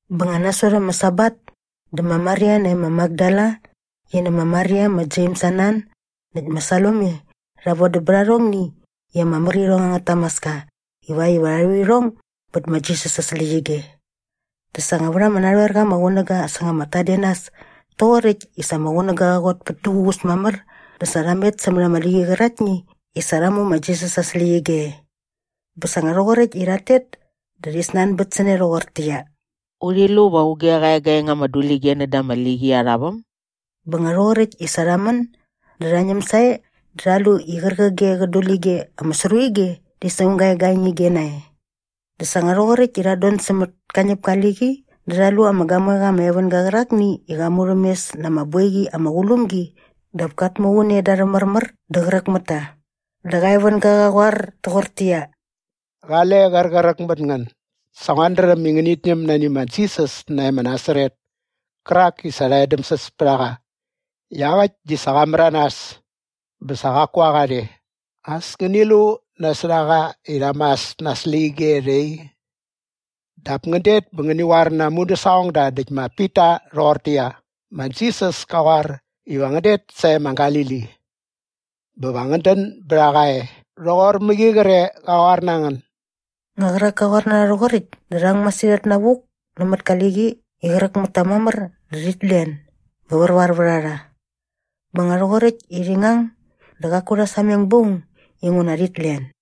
Bä nga nasot ama Sabat dä ma Maria nae ma Makdala qi nä ma Maria ma Jems aa nan näkt ma Salome rha vodäm bät arhongni i ama mär irhong angät tamaska ivakt iva rha rhu irhong bät ma Jisas aa släqyige. Dä sa nga vät ama narhoerqa ama qunäga säng ama tadenas toqoräkt i sa ama qunäga qa qot pät duququs mamär dä sa rha met sämät ama liqi qäraktni i sa rha mu ma Jisas aa släqyige e. Bä sa nga rhoqoräkt i rhat tet dä rhi snanbät sä ne rhoqortäqyia, “Urhi lu va auge qä egaeng ama dulige näda ama liqi arha väm?” Bä nga rhoqoräkt i sa rha män dä rha ñäm sae dä rha lu i qärqige qä dulige ama sru ige di sa aung ga egaeng ige nae. Dä sa nga rhoqoräkt i rhat don sämät ka ñäpka aa liqi dä rha lu ama gamoeqa ama evänga qärakni i qa murhämes na ama boiqi ama qulum gi dap kat muqun e da arhä märmär dä qräk mät ta. Dä qa evänga qa qoar toqortäqyia, “Qale qräqräk mät ngän. Sa nguat dräm i ngänit ñäm nani ma Jisas nae ma Nasaret kärak i sa rha edämsäs pät a qa. Iaqäkt di sa qa märanas! Bä sa qaku a qa rhe. As ngäni lu nasot a qa i rha mas na aa släqyige rhe i. Dap ngän det bä ngäni qoar na aa mudäsaqongda näkt ma Pita rhoqortäqyia, ‘Ma Jisas ka qoar iva ngän det sae ma Galili. Bä va ngän dän bät a qa e rhoqor mäqi qre qa qoar na ngän.’” Nga qärak ka qoar na rha rhoqoräkt dä rha ang masirhat navuk nämät ka liqi i qräk mät ta mamär dä rhit len bä värvar vät a rha. Bä nga rhoqoräkt i rhi ngang dä qaku rha sameng ba aung inguna rhit len.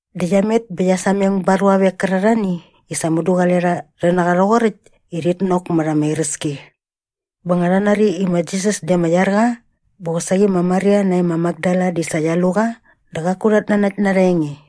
Dä qia met bä qia sameng ba aa ruavek kärarhani i sa mudu qale rha rhi na qa rhoqoräkt i rhit nok mät ama iräski. Bä nga rha nari i ma Jisas di ama iar qa bä qosaqi ma Maria nae ma Makdala di sa qia lu qa dä qaku rhat nanakt na arha enge.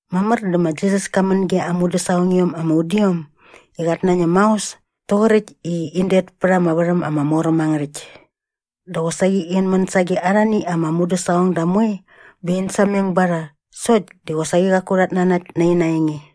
Mamär dä ma Jisas ka män ge aa mudäsaqongiom ama udiom i qat nañäm maos toqoräkt i in det pät ama värhäm ama mor äm angä rhäkt. Dä qosaqi in män sage arhani ama mudäsaqongda moe bä in sameng ba rha sokt di qosaqi qaku rhat nanakt na ina enge.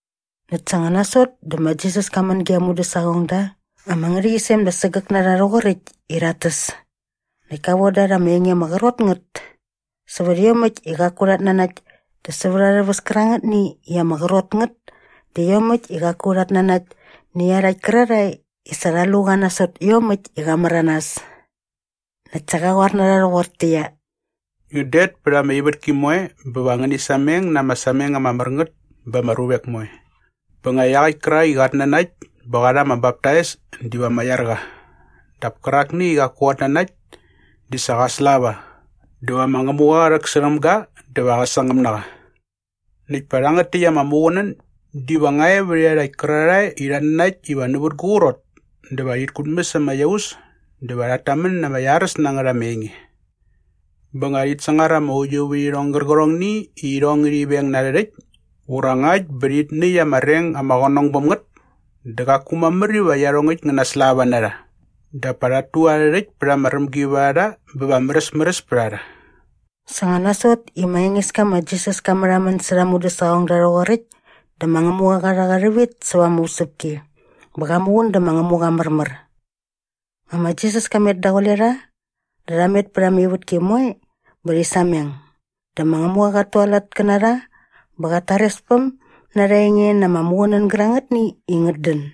Näkt sa nga nasot dä ma Jisas ka män ge aa mudäsaqongda ama ngärhäqyisem da sägäk na rha rhoqoräkt i rhat täs näkt ka von da rha ama enge ama qrot ngät sävät iomäkt i qaku rhat nanakt dä sävät arhä väs kärangätni i ama qrot ngät dä iomäkt i qaku rhat nanakt nä iarhakt kärarhae i sa rha lu qa nasot iomäkt i qa märanas. Näkt sa qa qoar na rha rhoqortäqyia, “Ngän det pät ama ivätki moe bä va ngäni sameng na ama sameng ama mär ngät ba ama ruvek moe. Bä nga iaqäkt kärak i qat nanakt bä qa rha ama baptais diva ama iar qa dap kärakni i qaku qat nanakt di sa qa slava dä va ma Ngämuqa qä rhäksärhäm ga dä va qä sangäm na qa. Näkt pa rhangät täkt ama muqunän diva nga e vät iarhakt kärarhae i rhat nanakt iva nävät gu qrot dä va rhit kutmäs ama iaus dä va rhat tamän na ama iaräs na ngät ama enge. Bä nga rhit sangar ama uiuvärhirhong gärqärhongni i irhong ngärhi veng na arhä rhäkt ura ngakt bä rhit näkt anga reng ama qänong bäm ngät dä qaku mamär iva iarhongäkt ngä naslava na rha. Dap pa rhat tu arhä rhäkt pät ama rämgivärharha bä va märäsmäräs pät a rha.” Sa nga nasot i ma Engeska ma Jisas ka märhamän särha aa mudäsaqongda rhoqoräkt dä ma Ngämuqa qa rha qa rhävit säva ama usäpki bä qa muqun dä ma Ngämuqa aa märmär. Nga ma Jisas ka met daqule rha dä rha met pät ama ivätki moe bä rhi sameng. Dä ma Ngämuqa qat tualat kä na rha bä qät tarespäm na arha enge na ama muqunän gärangätni i ngät dän.]